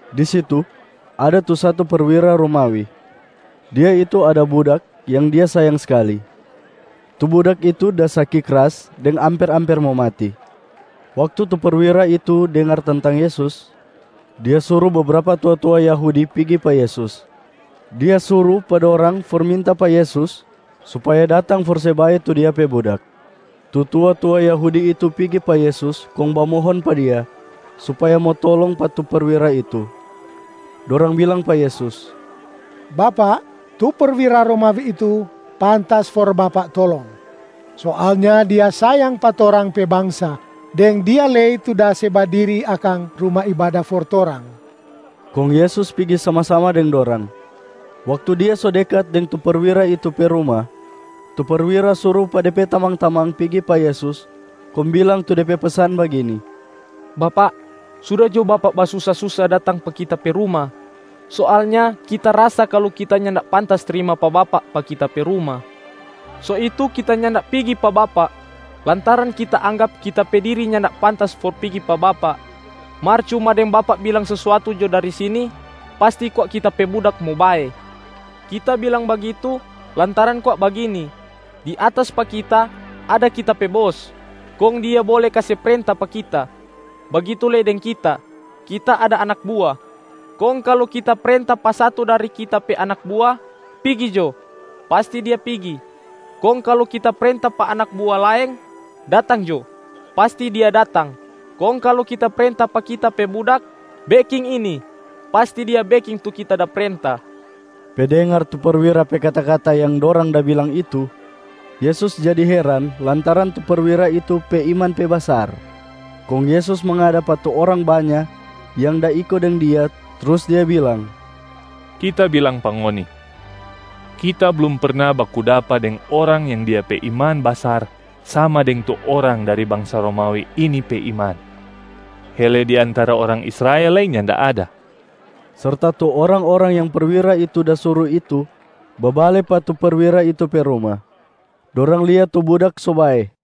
Di situ, ada tu satu perwira Romawi. Dia itu ada budak yang dia sayang skali. Tu budak itu da saki kras deng amper-amper mo mati. Waktu tu perwira itu dengar tentang Yesus, dia suru bebrapa tua-tua Yahudi pigi pa Yesus. Dia suru pa dorang for minta pa Yesus supaya datang for se bae tu dia pe budak. Tu tua-tua Yahudi itu pigi pa Yesus kong bamohon pa Dia supaya mo tolong pa tu perwira itu. Dorang bilang pa Yesus, “Bapak, tu perwira Romawi itu pantas for Bapak tolong. Soalnya dia sayang pa torang pe bangsa deng dia lei tu da se badiri akang ruma ibada for torang.” Kong Yesus pigi sama-sama deng dorang. Waktu Dia so dekat deng tu perwira itu pe ruma, tu perwira suru pa de pe tamang-tamang pigi pa Yesus kong bilang tu de pe pesan bagini, “Bapak, suda jo Bapak basusa-susa datang pa kita pe ruma. Soalnya kita rasa kalu kita nyanda pantas trima pa Bapak pa kita pe ruma. So itu kita nyanda pigi pa Bapak, lantaran kita anggap kita pe diri nyanda pantas for pigi pa Bapak. Mar cuma deng Bapak bilang sesuatu jo dari sini, pasti kwa kita pe budak mo bae. Kita bilang bagitu, lantaran kwa bagini: di atas pa kita, ada kita pe bos, kong dia bole kase prenta pa kita. Bagitu lei deng kita, kita ada anak bua. Kong kalu kita prenta pa satu dari kita pe anak bua, ‘Pigi jo!’ pasti dia pigi. Kong kalu kita prenta pa anak bua laeng, ‘Datang jo!’ pasti dia datang. Kong kalu kita prenta pa kita pe budak, ‘Beking ini!’ pasti dia beking tu kita da prenta.” Pe dengar tu perwira pe kata-kata yang dorang da bilang itu, Yesus jadi heran lantaran tu perwira itu pe iman pe basar. Kong Yesus mangada pa tu orang banya yang da iko deng Dia, trus Dia bilang, “Kita bilang pa ngoni, Kita blum perna baku dapa deng orang yang dia pe iman basar sama deng tu orang dari bangsa Romawi ini pe iman, hele di antara orang Israel lei nyanda ada.” Serta tu orang-orang yang perwira itu da suru itu babale pa tu perwira itu pe ruma, dorang lia tu budak so bae.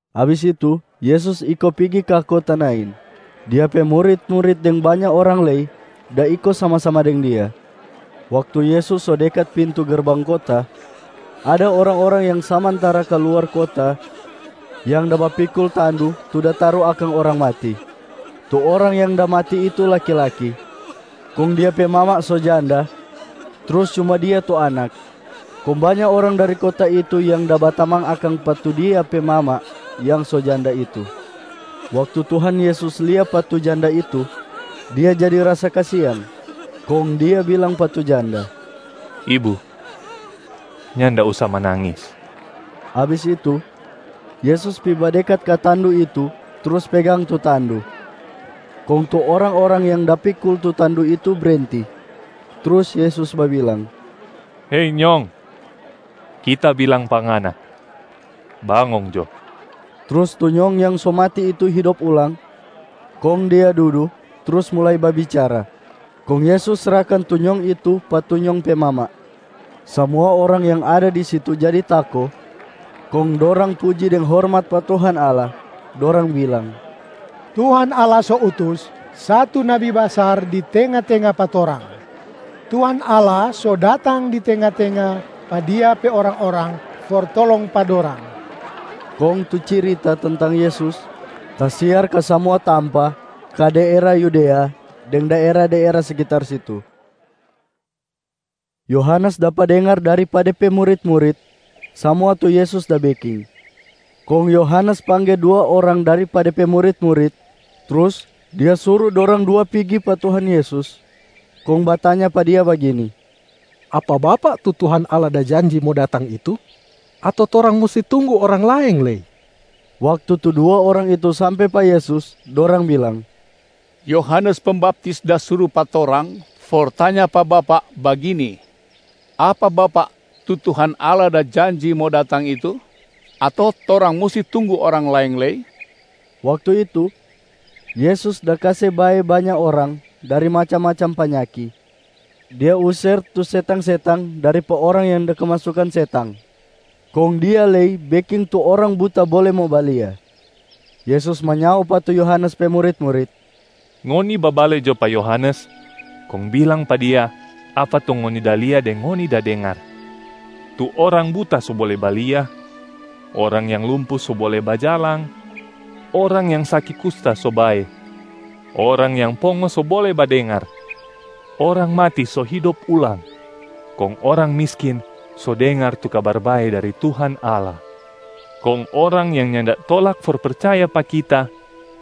Abis itu Yesus iko pigi ka kota Nain. Dia pe murit-murit deng banya orang lei da iko sama-sama deng Dia. Waktu Yesus so dekat pintu gerbang kota, ada orang-orang yang samantara kaluar kota yang da bapikul tandu tu da taru akang orang mati. Tu orang yang da mati itu laki-laki, kong dia pe mama so janda trus cuma dia tu anak. Kong banya orang dari kota itu yang da batamang akang pa tu dia pe mama yang so janda itu. Waktu Tuhan Yesus lia pa tu janda itu, Dia jadi rasa kasiang. Kong Dia bilang pa tu janda, “Ibu, nyanda usa manangis!” Abis itu, Yesus pi badekat ka tandu itu trus pegang tu tandu, kong tu orang-orang yang da pikul tu tandu itu brenti. Trus Yesus babilang, “Hei nyong, Kita bilang pa ngana, bangong jo!” Trus tu nyong yang so mati itu hidop ulang, kong dia dudu, trus mulai babicara. Kong Yesus srahkan tu nyong itu pa tu nyong pe mama. Samua orang yang ada di situ jadi tako kong dorang puji deng hormat pa Tuhan Allah. Dorang bilang, “Tuhan Allah so utus satu nabi basar di tenga-tenga pa torang! Tuhan Allah so datang di tenga-tenga pa Dia pe orang-orang for tolong pa dorang!” Kong tu cirita tentang Yesus tasiar ka samua tampa ka daera Yudea deng daera-daera sekitar situ. Yohanes dapa dengar dari pa de pe murit-murit samua tu Yesus da beking. Kong Yohanes pangge dua orang dari pa de pe murit-murit, trus dia suru dorang dua pigi pa Tuhan Yesus kong batanya pa Dia bagini, “Apa Bapak tu Tuhan Allah da janji mo datang itu? Ato torang musti tunggu orang laeng lei?” Waktu tu dua orang itu sampe pa Yesus, dorang bilang, “Yohanes Pembaptis da suru pa torang for tanya pa Bapak bagini, ‘Apa Bapak tu Tuhan Allah da janji mo datang itu? Ato torang musti tunggu orang laeng lei?’” Waktu itu, Yesus da kase bae banya orang dari macam-macam panyaki, Dia user tu setang-setang dari pa orang yang da kemasukan setang, kong Dia lei beking tu orang buta bole mo balia. Yesus manyao pa tu Yohanes pe murit-murit, “Ngoni babale jo pa Yohanes kong bilang pa dia apa tu ngoni da lia deng ngoni da dengar: tu orang buta so bole balia, orang yang lumpu so bole bajalang, orang yang saki kusta so bae, orang yang pongo so bole badengar, orang mati so hidop ulang, kong orang miskin so dengar tu Kabar Bae dari Tuhan Allah. Kong orang yang nyanda tolak for percaya pa Kita,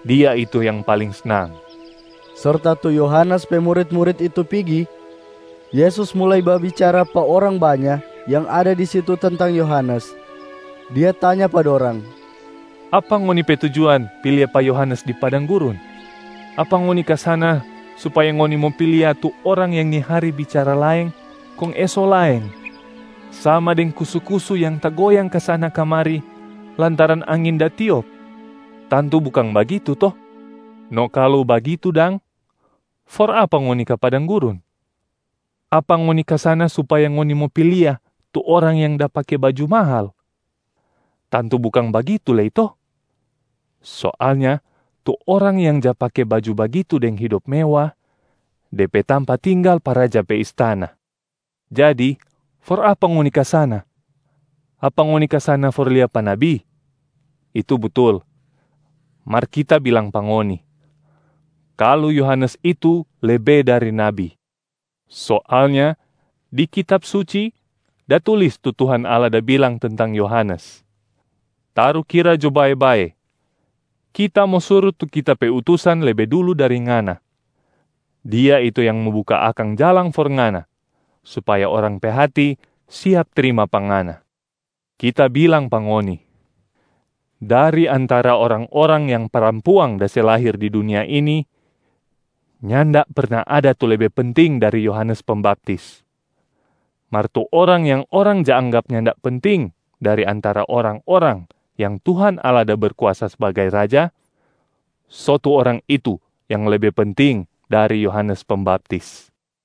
dia itu yang paling snang.” Serta tu Yohanes pe murit-murit itu pigi, Yesus mulai babicara pa orang banya yang ada di situ tentang Yohanes. Dia tanya pa dorang, “Apa ngoni pe tujuan pi lia pa Yohanes di padang gurun? Apa ngoni ka sana supaya ngoni mo pi lia tu orang yang ni hari bicara laeng kong eso laeng, sama deng kusu-kusu yang tagoyang kasana-kamari lantaran angin da tiop? Tantu bukang bagitu to? No kalu bagitu dang, for apa ngoni ka padang gurun? Apa ngoni ka sana supaya ngoni mo pi lia tu orang yang da pake baju mahal? Tantu bukang bagitu lei to? Soalnya tu orang yang ja pake baju bagitu deng hidop mewa, de pe tampa tinggal pa raja pe istana. Jadi for apa ngoni ka sana? Apa ngoni ka sana for lia pa nabi? Itu Butul. Mar Kita bilang pa ngoni, kalu Yohanes itu lebe dari nabi. Soalnya di Kitab Suci da tulis tu Tuhan Allah da bilang tentang Yohanes, ‘Tarukira jo bae-bae, Kita mo suru tu Kita pe utusan lebe dulu dari Ngana. Dia itu yang mo buka akang jalang for Ngana supaya orang pe hati siap trima pa Ngana.’ Kita bilang pa ngoni, dari antara orang-orang yang parampuang da se lahir di dunia ini, nyanda perna ada tu lebe penting dari Yohanes Pembaptis. Mar tu orang yang orang ja anggap nyanda penting dari antara orang-orang yang Tuhan Allah da Berkuasa sbagai Raja, so tu orang itu yang lebe penting dari Yohanes Pembaptis.”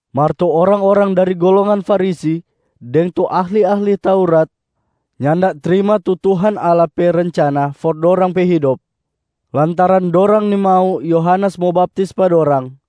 Mar tu orang-orang dari golongan Farisi deng tu ahli-ahli Taurat nyanda trima tu Tuhan Allah pe rencana for dorang pe hidop, lantaran dorang nimau Yohanes mo baptis pa dorang.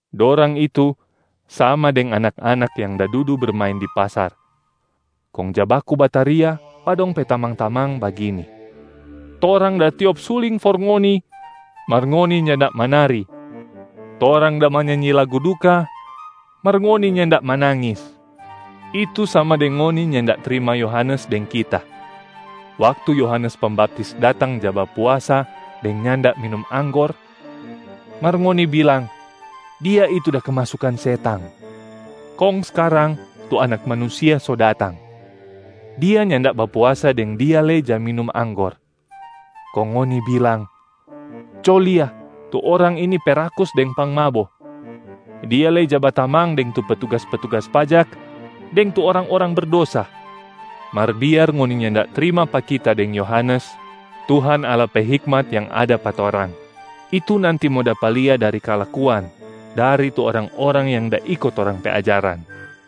Dorang itu sama deng anak-anak yang da dudu bermain di pasar, kong ja baku bataria pa dong pe tamang-tamang bagini, ‘Torang da tiop suling for ngoni, mar ngoni nyanda manari. Torang da manyanyi lagu duka, mar ngoni nyanda manangis.’ Itu sama deng ngoni nyanda trima Yohanes deng Kita. Waktu Yohanes Pembaptis datang ja bapuasa deng nyanda minum anggor, mar ngoni bilang, ‘Dia itu da kemasukan setang.’ Kong skarang tu Anak Manusia so datang. Dia nyanda bapuasa deng Dia lei ja minum anggor, kong ngoni bilang, ‘Co lia, tu orang ini pe rakus deng pangmabo. Dia lei ja batamang deng tu petugas-petugas pajak deng tu orang-orang berdosa.’ Mar biar ngoni nyanda trima pa Kita deng Yohanes, Tuhan Allah pe hikmat yang ada pa torang, itu nanti mo dapa lia dari kalakuan dari tu orang-orang yang da iko torang pe ajaran.”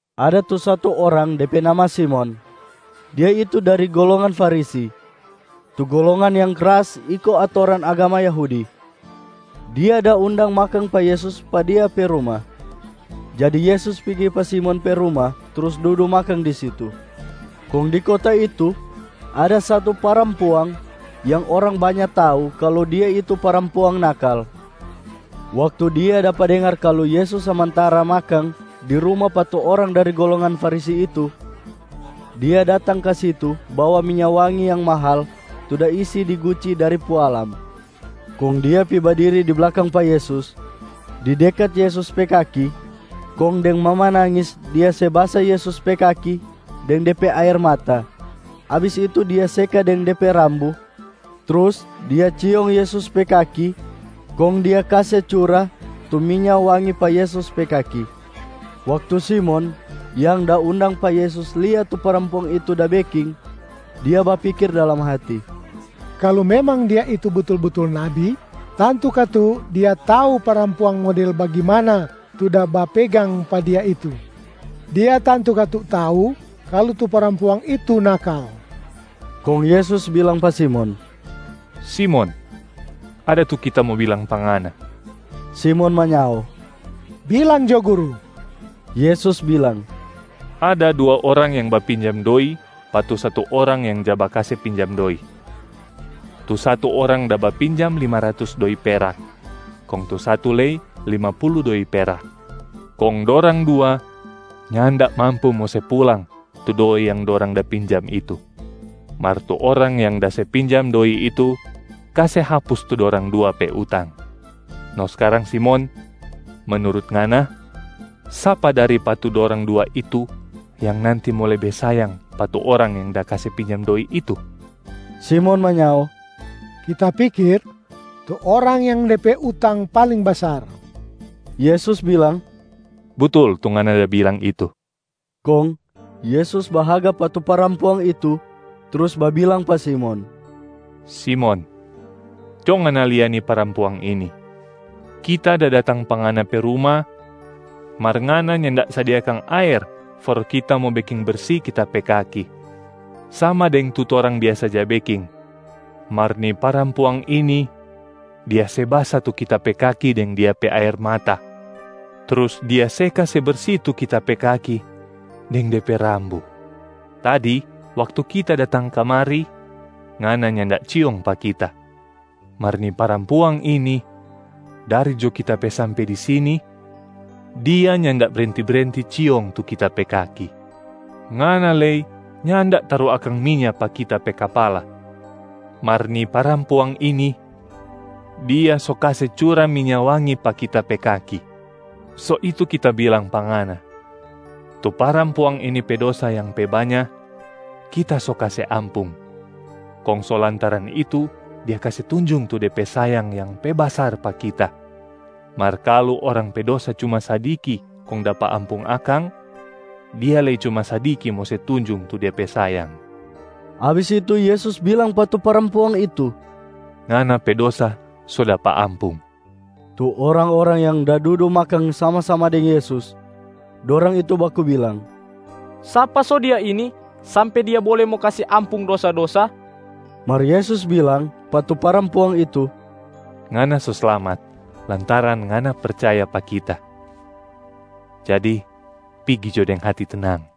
Ada tu satu orang de pe nama Simon, dia itu dari golongan Farisi, tu golongan yang kras iko atoran agama Yahudi. Dia da undang makang pa Yesus pa dia pe ruma. Jadi Yesus pigi pa Simon pe ruma trus dudu makang di situ. Kong di kota itu ada satu parampuang yang orang banya tau kalu dia itu parampuang nakal. Waktu dia dapa dengar kalu Yesus samantara makang di ruma pa tu orang dari golongan Farisi itu, dia datang ka situ bawa minya wangi yang mahal tu da isi di guci dari pualam. Kong dia pi badiri di blakang pa Yesus, di dekat Yesus pe kakia. Kong deng mamanangis dia se basa Yesus pe kaki deng de pe aer mata, abis itu dia seka deng de pe rambu. Trus dia ciong Yesus pe kaki kong dia kase cura tu minya wangi pa Yesus pe kaki. Waktu Simon yang da undang pa Yesus lia tu parampuang itu da beking, dia bapikir dalam hati, “Kalu memang Dia itu butul-butul nabi, tantu katu Dia tau parampuang model bagimana tu da bapegang pa Dia itu. Dia tantu katu tau kalu tu parampuang itu nakal.” Kong Yesus bilang pa Simon, “Simon, ada tu Kita mo bilang pa ngana.” Simon manyao, “Bilang jo Guru.” Yesus bilang, “Ada dua orang yang bapinjam doi pa tu satu orang yang ja bakase pinjam doi. Tu satu orang da bapinjam lima ratus doi perak, kong tu satu lei lima pulu doi perak. Kong dorang dua nyanda mampu mo se pulang tu doi yang dorang da pinjam itu. Mar tu orang yang da se pinjam doi itu kase hapus tu dorang dua pe utang. No skarang Simon, menurut ngana, sapa dari pa tu dorang dua itu yang nanti mo lebe sayang pa tu orang yang da kase pinjam doi itu?” Simon manyao, “Kita pikir, tu orang yang de pe utang paling basar.” Yesus bilang, “Butul tu ngana da bilang itu.” Kong Yesus bahaga pa tu parampuang itu trus babilang pa Simon, “Simon, co ngana lia ni parampuang ini. Kita da datang pa ngana pe ruma, mar ngana nyanda sadia akang aer for Kita mo beking bersi Kita pe kaki sama deng tu torang biasa ja beking. Mar ni parampuang ini dia se basa tu Kita pe kaki deng dia pe aer mata, trus dia seka se bersi tu Kita pe kaki deng de pe rambu. Tadi waktu kita datang kamari, ngana nyanda ciong pa kita. Mar ni parampuang ini, dari jo Kita pe sampe di sini, dia nyanda brenti-brenti ciong tu kita pe kaki. Ngana lei nyanda taru akang minya pa Kita pe kapala, mar ni parampuang ini, dia so kase cura minya wangi pa Kita pe kaki. So itu Kita bilang pa ngana, tu parampuang ini pe dosa yang pe banya Kita so kase ampung, kong so lantaran itu dia kase tunjung tu de pe sayang yang pe basar pa Kita. Mar kalu orang pe dosa cuma sadiki kong dapa ampung akang, dia lei cuma sadiki mo se tunjung tu dia pe sayang.” Abis itu Yesus bilang pa tu parampuang itu, “Ngana pe dosa so dapa ampung!” Tu orang-orang yang da dudu makang sama-sama deng Yesus, dorang itu baku bilang, “Sapa so Dia ini sampe Dia bole mo kase ampung dosa-dosa?” Mar Yesus bilang pa tu parampuang itu, “Ngana so slamat lantaran ngana percaya pa Kita. Jadi pigi jo deng hati tenang!”